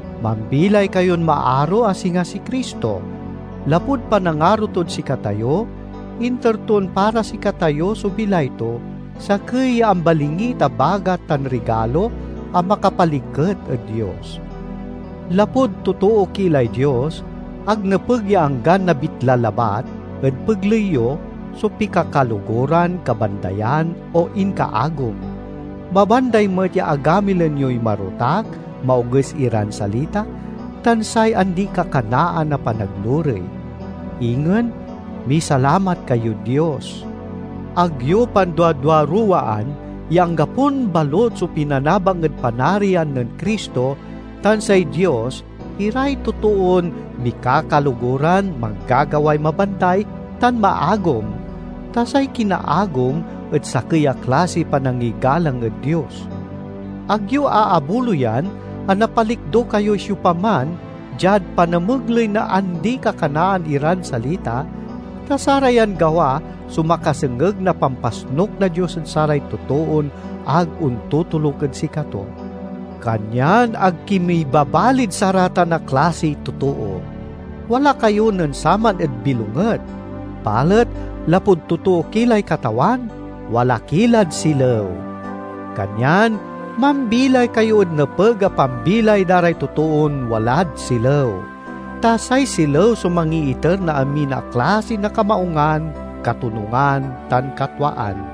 Mambilay kayon maaro a singa si Cristo; lapud panangaro tod sikatayo, inter ton para sikatayo so bilay to, sakey ya ambalingit a bagat tan rigalo a makapaliket ed Dios. Lapud totoo ki lay Dios, ag nepeg ya anggan nabitla labat ed pegley yo so pikakaloguran, kabandayan, o inkaagom. Mabanday met ya agamilen yoy marotak, maoges iran salita, tan say andikakanaan a panaglurey. Ingen, misalamat kayod Dios. Ag yo panduaduaruwaan ya anggapon balut so pinanabang ed Panarian nen Cristo tan say Dios iray totoon mikakaloguran, manggagaway mabanday, tan maagom (ta say kinaagom et sakey a klasiy panangigalang ed dios). Ag yo aabuloyan a napalikdo kayoy siopaman diad panamegley na andi-kakanaan iran salita, ta sarayan gawa so makasengeg na pampasnuk na Dios ed saray totoon ag ontotoluk ed sikato. Kanyan ag ki mibabalid saratan a klasiy totoo. Wala kayo nen saman ed bilonget, balet lapud totoo ki lay Katawan, wala ki lad silew. Kanyan mambilay kayo ed nepeg a pambilay da ray totoon walad silew. Ta say silew so mangiiter na amin a klasi na kamaungan, katonungan, tan katwaan.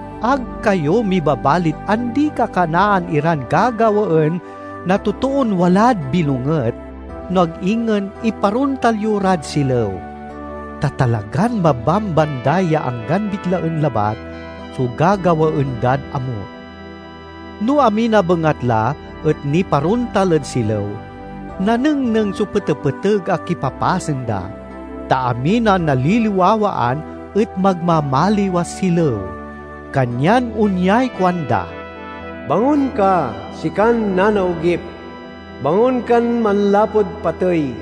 Ag kayo mibabalid andi-kakanaan iran gagawaen na totoon walad bilonget, no ag ingen iparontal yo rad silew. (Ta talagan mabambanday ya anggan bitlaen labat so gagawaen dad amut.) No amin a bengatla et niparontal ed silew, nanengneng so petepeteg a kipapasen da; ta amin a naliliwawaan et magmamaliw a silew. Kanyan onyay kuanda, "Bangon ka, sikan nanaogip, bangon kan manlapud patey,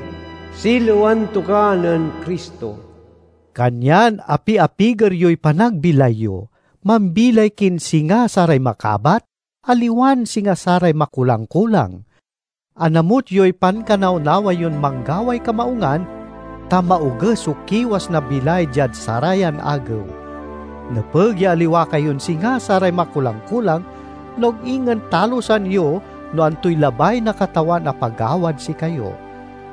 silewan to ka nen Cristo." Kanyan api-apiger yoy panagbilay yo. Mambilay kin singa saray makabat, aliwan singa saray makulang-kulang. Anamut yoy pankanawnawa yon manggaway kamaungan, ta maoges so kiwas na bilay diad sarayan agew. Nepeg ya aliwa kayon singa saray makulang-kulang, no ag ingen talusan yo no antoy labay na Katawan a pagawad sikayo.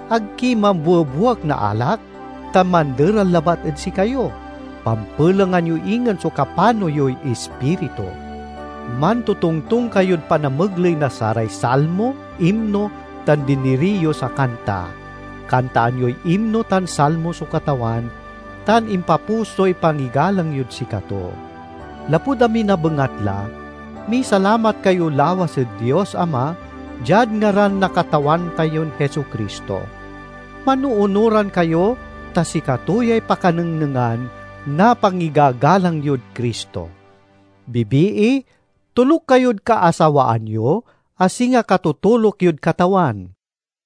Ag ki mambuebuek na alak, ta manderal labat ed sikayo; pampelengan yo ingen so kapano yoy Ispiritu. Mantotongtong kayod panamegley na saray salmo, imno, tan diniriyos a kanta. Kantaan yoy imno tan salmo so Katawan, tan impapusoy pangigalang yod sikato. Lapud amin a bengatla, misalamat kayo lawas ed Dios Ama, diad ngaran na Katawan tayon Jesu-Cristo. Manoonuran kayo ta sikato yay pakanengnengan na pangigagalang yod Cristo. Bibii, toluk kayod kaasawaan yo, a singa katotoluk yod Katawan.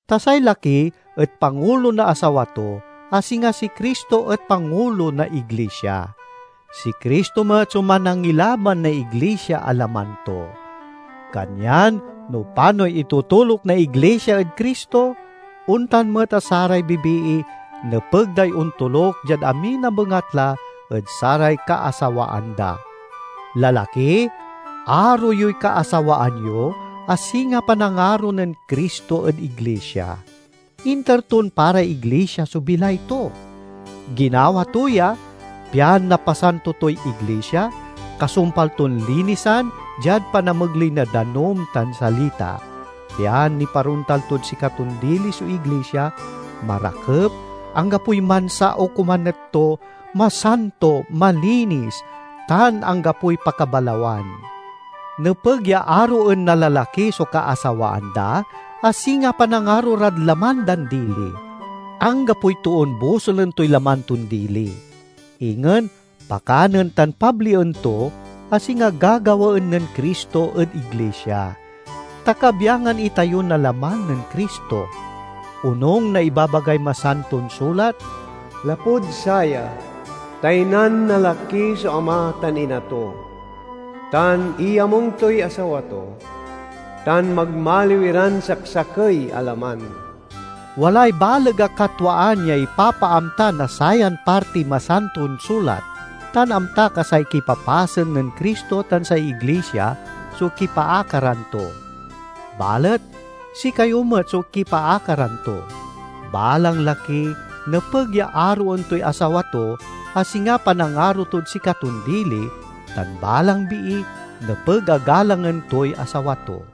Ta say laki et pangulo na asawa to, a singa si Cristo et pangulo na iglisia. Si Cristo met so Manangilaban na iglisia a laman to. Kanyan no panoy itotoluk na iglisia ed Cristo, ontan met a saray bibii nepeg day ontoluk diad amin a bengatla ed saray kaasawaan da. Lalaki, aro yoy kaasawaan yo, a singa panangaro nen Cristo ed iglisia. Inter ton para iglisia so bilay to. Ginawa to ya pian napasanto toy iglisia, kasumpal ton linisan diad panamegley na danum tan salita, pian niparontal tod sikaton dili so iglisia—marakep, anggapoy mansa o komanet to, masanto, malinis, tan anggapoy pakabalawan. Nepeg ya aroen na lalaki so kaasawaan da a singa panangaro rad laman dan dili. Anggapoy toon bosulen toy laman ton dili. Ingen, pakanen tan pablien to, a singa gagawaen nen Cristo ed iglisia; ta kabyangan itayo na laman nen Cristo. Onung na ibabagay Masanton Sulat, "Lapud saya, taynan na laki so ama tan ina to, tan iyamung toy asawa to, tan magmaliw iran saksakey a laman." Walay baleg a katwaan ya ipapaamta na sayan partiy Masanton Sulat, tan amtak a say kipapasen nen Cristo tan say iglisia so kipaakaran to. Balet sikayo met so kipaakaran to: balang laki nepeg ya aroen toy asawa to a singa panangaro tod sikaton dili, tan balang bii nepeg a galangen toy asawa to.